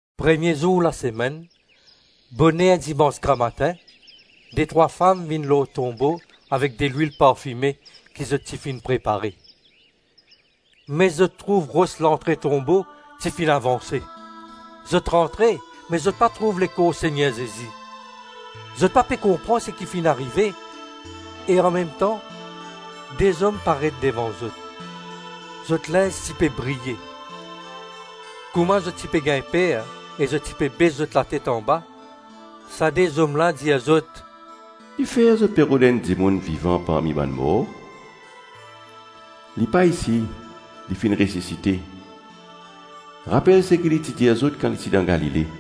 Premie zour lasemenn, boner dimans gramatin, detrwa fam vinn lor tonbo avek delwil parfime ki zot ti finn prepare. Me zot trouv ros lantre tonbo ti finn avanse. Zot rantre me zot pa trouv lekor Segner Zezi. Zot pa pe konpran seki finn arive e anmemtan de zom paret devan zot. Zot linz ti pe briye. Kouma zot ti pe gagn per e zot ti pe bes zot latet anba, sa de zom la dir zot, “Kifer zot pe rod enn dimoun vivan parmi bann mor; li pa isi, li finn resisite. Rapel seki li ti dir zot kan li ti dan Galile.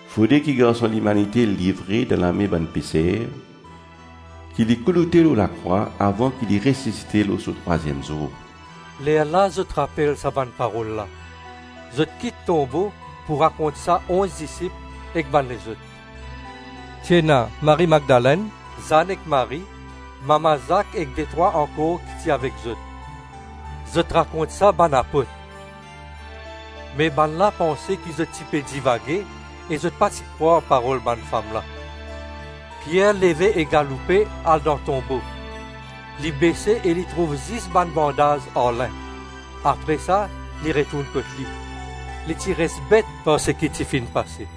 ‘Fode ki Garson Limanite livre dan lame bann peser, ki li kouloute lor lakrwa avan ki li resisite lor so trwaziem zour.’” Lerla zot rapel sa bann parol la. Zot kit tonbo pou rakont sa onz disip ek bann lezot. Ti ena Marie Madlenn, Zann ek Marie, mama Zak ek detrwa ankor ki ti avek zot. Zot rakont sa bann apot. Me bannla panse ki zot ti pe divage e zot pa ti krwar parol bann fam la. Pier leve e galoupe, al dan tonbo. Li bese e li trouv zis bann bandaz an lin; apre sa li retourn kot li. Li ti res bet par seki ti finn pase.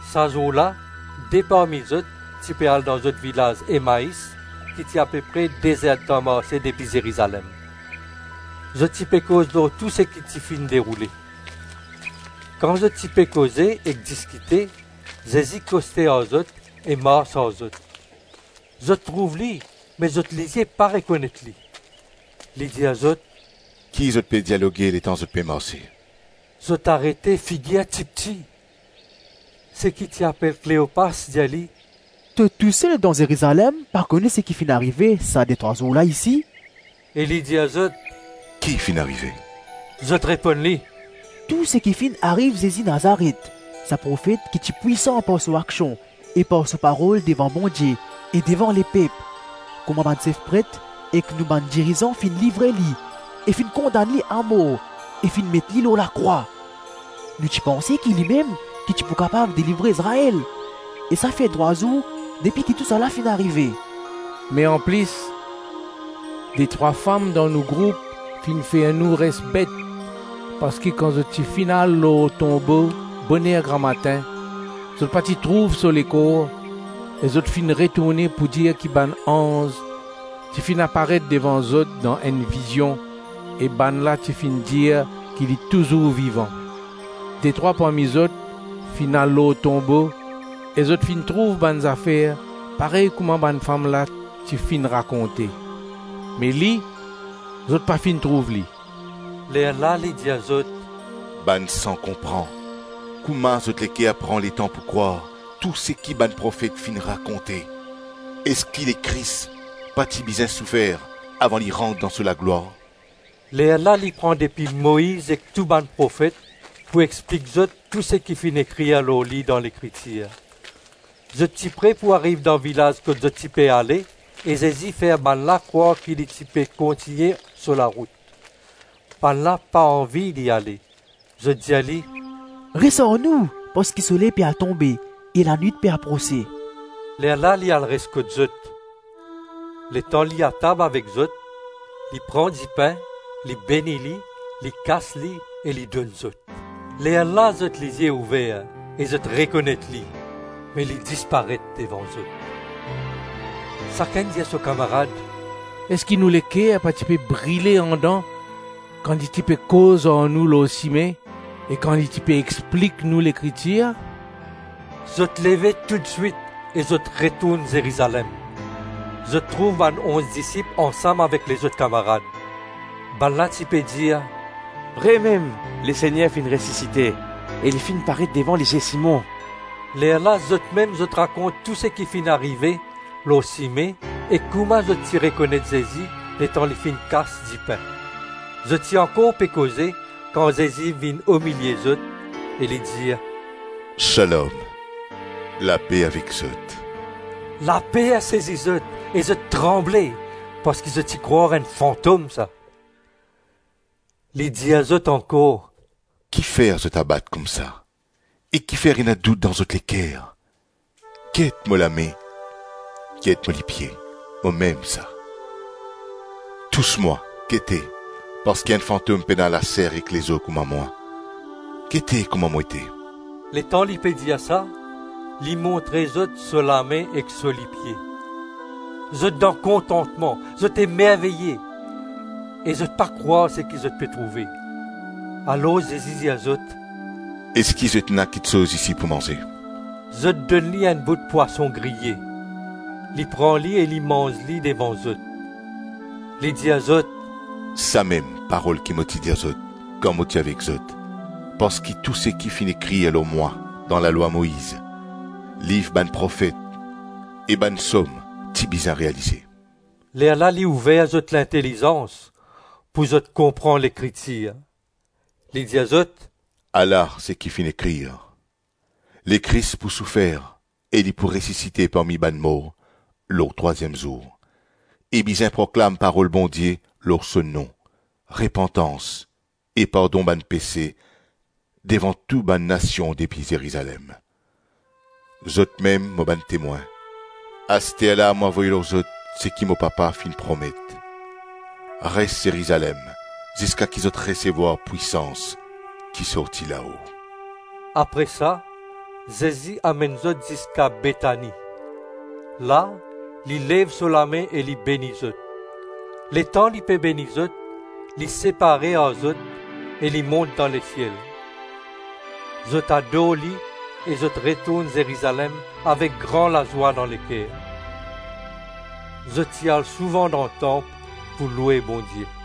Sa zour la, de parmi zot, ti pe al dan zot vilaz Emais ki ti apepre de zer-tan marse depi Zerizalem. Zot ti pe koz lor tou seki ti finn deroule. Kan zot ti pe koze ek diskite, Zezi koste ar zot e mars ar zot. Zot trouv li me zot lizie pa rekonet li. Li dir zot, “Ki zot pe dialoge letan zot pe marse? “ Zot arete, figir tipti. Seki ti apel Kleopas dir li, “To tousel dan Zerizalem pa kone seki finn arive sa detrwa zour la isi?” E li dir zot, “Ki finn arive? “Zot reponn li, “Tou seki finn ariv Zezi Nazaret, sa profet ki ti pwisan par so aksion e par so parol devan Bondie e devan lepep; kouma bann sef pret ek nou bann dirizan finn livre li e finn kondann li amor e finn met li lor lakrwa. Nou ti panse ki limem ki ti pou kapav delivre Izrael; e sa fer trwa zour depi ki tousala finn arive. Me anplis, detrwa fam dan nou group finn fer nou res bet parski kan zot ti finn al lor tonbo boner gramatin, zot pa ti trouv so lekor e zot finn retourne pou dir ki bann anz ti finn aparet devan zot dan enn vizion e bannla ti finn dir ki li touzour vivan. Detrwa parmi zot finn al lor tonbo e zot finn trouv bann zafer parey kouma bann fam la ti finn rakonte, me li, zot pa finn trouv li.” Lerla li dir zot, “Bann san konpran, kouma zot leker pran letan pou krwar tou seki bann profet finn rakonte. Eski Lekris pa ti bizin soufer avan li rant dan so laglwar?” Lerla li pran depi Moiz ek tou bann profet pou explik zot tou seki finn ekrir lor li dan Lekritir. Zot ti pre pou ariv dan vilaz kot zot ti pe ale e Zezi fer bannla krwar ki li ti pe kontigne so larout. Bannla pa anvi li ale, zot dir li, “Res ar nou parski soley pe al tonbe e lanwit pe aprose.” Lerla li al res kot zot. Letan li atab avek zot, li pran dipin, li beni li, li kas li e li donn zot. Lerla zot lizie ouver e zot rekonet li me li disparet devan zot. Sakenn dir so kamarad, “Eski nou leker pa ti pe brile andan kan li ti pe koz ar nou lor sime e kan li ti pe explik nou Lekritir?” Zot leve toutswit e zot retourn Zerizalem. Zot trouv bann onz disip ansam avek lezot kamarad Bannla ti pe dir, “Vremem Lesegner finn resisite e li finn paret devan lizie Simon.” Lerla zotmem, zot rakont tou seki finn arive lor sime e kouma zot ti rekonet Zezi letan li ti finn kas dipin. Zot ti ankor pe koze kan Zezi vinn omilie zot e li dir, “Shalom, Lape avek zot.” Laper sezi zot e zot tranble parski zot ti krwar enn fantom sa. Li dir zot ankor, “Kifer zot abat koumsa e kifer ena dout dan zot leker? Get mo lame, get mo lipie, momem sa. Tous mwa, gete, parski enn fantom pena laser ek lezo kouma mwa. Gete kouma mo ete. Letan li pe dir sa, li montre zot so lame ek so lipie. Zot dan kontantman, zot emerveye e zot pa krwar seki zot pe trouve; alor Zezi dir zot, “Eski zot ena kiksoz isi pou manze?” Zot donn li enn bout pwason griye; li pran li e li manz li devan zot. Li dir zot, “Samem parol ki mo ti dir zot kan mo ti avek zot parski tou seki finn ekrir lor mwa dan Lalwa Moiz, Liv bann Profet e bann Psom, ti bizin realize.” Lerla li ouver zot lintelizans pouki zot konpran Lekritir. Li dir zot, “Ala seki finn ekrir: Lekris pou soufer e li pou resisite parmi bann mor lor trwaziem zour e bizin proklam parol Bondie lor so nom, repantans e pardon bann pese devan tou bann nasion depi Zerizalem. Zotmem mo bann temwin. Asterla mo avoy lor zot seki mo Papa finn promet. Res Zerizalem ziska ki zot resevwar pwisans ki sorti lao.” Apre sa Zezi amenn zot ziska Betani; la, li lev so lame e li beni zot. Letan li pe beni zot, li separe ar zot e li mont dan lesiel. Zot ador li e zot retourn Zerizalem avek gran lazwa dan leker. Zot ti al souvan dan tanp pou loue Bondie.